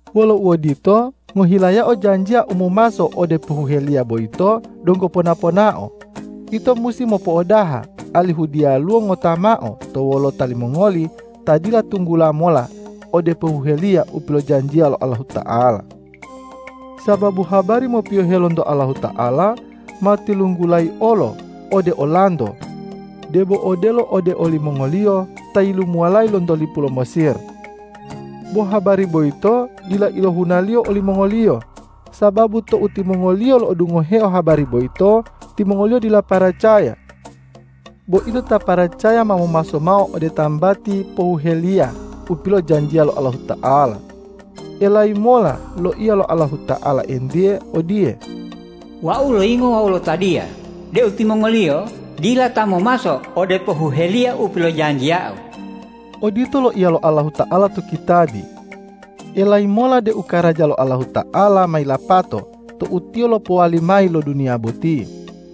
Wolo uodito, ngohilayao janjiya u momaso ode pohuheliya boyito donggo pona-ponao, ito musi mopo'odaha, alihu diyaluwo ngota mao to wolota limongoli ta dila tunggula mola ode pohuheliya u pilojanjiya lo Allahuta'ala. Sababu habari mopiyohe lonto Allahuta'ala ma tilunggulayi olo ode olanto, debo odelo ode olimongoliyo ta yilumuwalayi lonto lipu lo Mesir. Bo habari boyito dila ilohunaliyo olimongoliyo, sababu tou timongoliyo lo'odungoheo habari boyito, timongoliyo dila paracaya. Bo ito ta paracaya ma momaso mao ode tambati pohuheliya u pilojanjiya lo Allahuta'ala. Elayi mola loiya lo Allahuta'ala entiye odiye,”Wau loyingo wawu lotadiya deu timongoliyo dila ta momaso ode pohuheliya u pilojanjiya-U.” Odito loiya lo Allahuta'ala to kitabi. Elayi mola deu karaja lo Allahuta'ala ma yilapato tou Tiyo lopowali mayi lo duniya boti.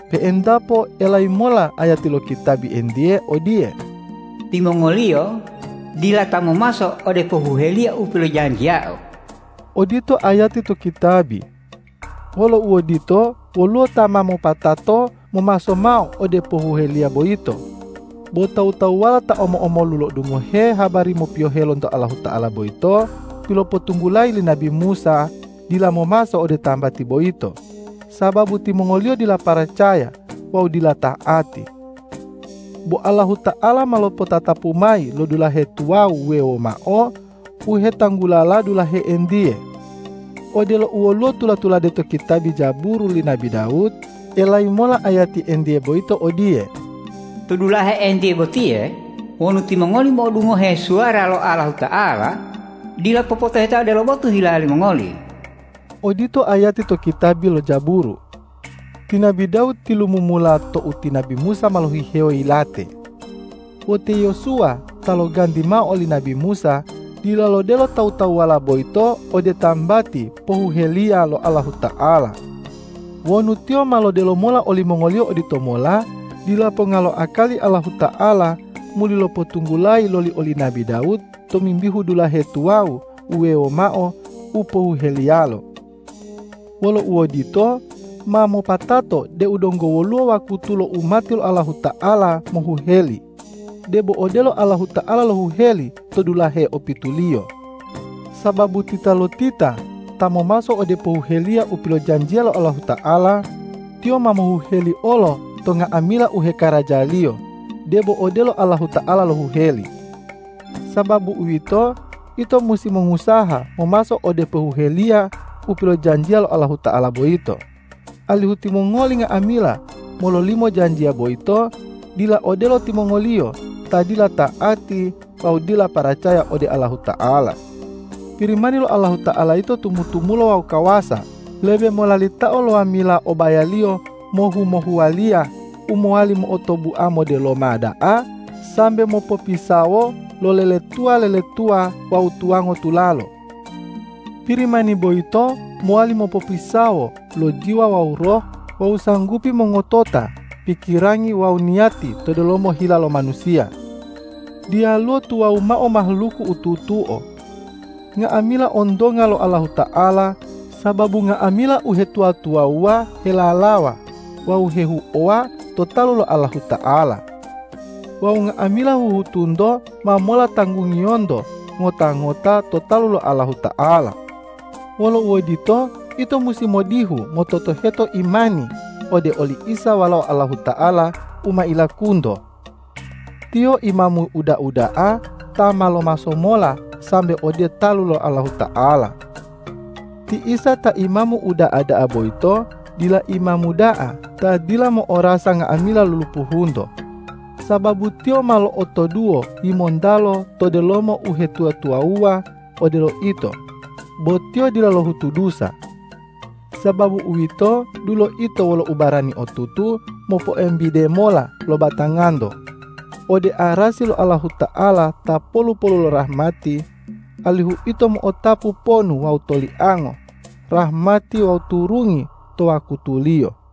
Pe'entapo elayi mola ayati lo kitabi entiye odiye,”Timongoliyo dila ta momaso ode pohuheliya u pilojanjiya-U.” Odito ayati to kitabi. Wolo uodito, woluwo ta ma mopatato momaso mao ode pohuheliya boyito. Bo tawu-tawuwala ta omo-omolu lo'odungohe habari mopiyohe lonto Allahuta'ala boyito pilopotunggulayi li nabi Musa, dila momaso ode tambati boyito, sababu timongoliyo dila paracaya wawu dila ta'ati. Bo Allahuta'ala ma lopotatapu mayi lo dulahe tuwawu wuwewo mao u hetanggulala dulahe entiye. Odelo u woluwo tula-tulade to kitabi Jaburu li nabi Dawud, elayi mola ayati entiye boyito odiye,”To dulahe entiye botiye wonu timongoli mo'odungohe suwara lo Allahuta'ala, dila popotoheta odelo botu hila limongoli.” Odito ayati to kitabi lo Jaburu. Ti nabi Dawud tilumumula tou ti nabi Musa ma lohihewo yilate. Bo te Yosuwa ta loganti mao oli nabi Musa, dila lodelo tawu-tawuwala boyito ode tambati pohuheliya lo Allahuta'ala. Wonu tiyo ma lodelo mola olimongoliyo oditomola, dila ponga lo akali Allahuta'ala muli lopotunggulayi loli oli nabi Dawud tomimbihu dulahe tuwawu wuwewo mao u pohuheliyalo. Wolo uodito, ma mopatato deu donggo woluwo wakutu lo umati lo Allahuta'ala mohuheli, debo odelo Allahuta'ala lohuheli to dulahe opituliyo. Sababu titalotita ta momaso ode pohuheliya u pilojanjiya lo Allahuta'ala, tiyo ma mohuheli olo to nga'amila u hekarajaliyo, debo odelo Allahuta'ala lohuheli. Sababu uwito, ito musi mongusaha momaso ode pohuheliya u pilojanjiya lo Allahuta'ala boyito, alihu timongoli nga'amila mololimo janjiya boyito, dila odelo timongoliyo ta dila ta'ati wawu dila paracaya ode Allahuta'ala. Pirimani lo Allahuta'ala yito tumu-tumulo wawu kawasa, lebe molalitao lo wamila o bayaliyo mohu-mohuwaliya, u mowali mo'otobua modeloma da'a sambe mopopisawo lo leletuwa-leletuwa wawu tuwango tulalo. Pirimani boyito mowali mopopisawo lo jiwa wawu roh wawu sanggupi mongotota pikirangi wawu niyati to delomo hila lo manusiya. Diyaluwo tuwawu mao mahaluku u tutuo. Nga'amila ontonga lo Allahuta'ala, sababu nga'amila uhetuwa-tuwawuwa helalawa wawu hehuowa to talu lo Allahuta'ala. Wawu nga'amila huhutunto ma mola tanggungiyonto ngota-ngota to talu lo Allahuta'ala. Wolo uodito, ito musi modihu mototoheto imani ode oli Isa Walao Allahuta'ala u ma ilakunto. Tiyo Imamu uda'a da'a ta ma lomaso mola sambe ode talu lo Allahuta'ala. Ti Isa ta Imamu uda'a da'a boyito dila imamu da'a ta dila mo'orasa nga'amila lulupuhunto, sababu Tiyo ma lo'otoduwo yimontalo to delomo uhetuwa-tuwawuwa odelo ito, bo Tiyo dila lohutu dusa! Sababu uwito, dulo ito wolo ubarani otutu mopoembide mola lo batanganto ode arasi lo Allahuta'ala ta polu-polu lo rahmati, alihu ito mo'otapu ponu wawu toliango, rahmati wawu turungi to wakutuliyo.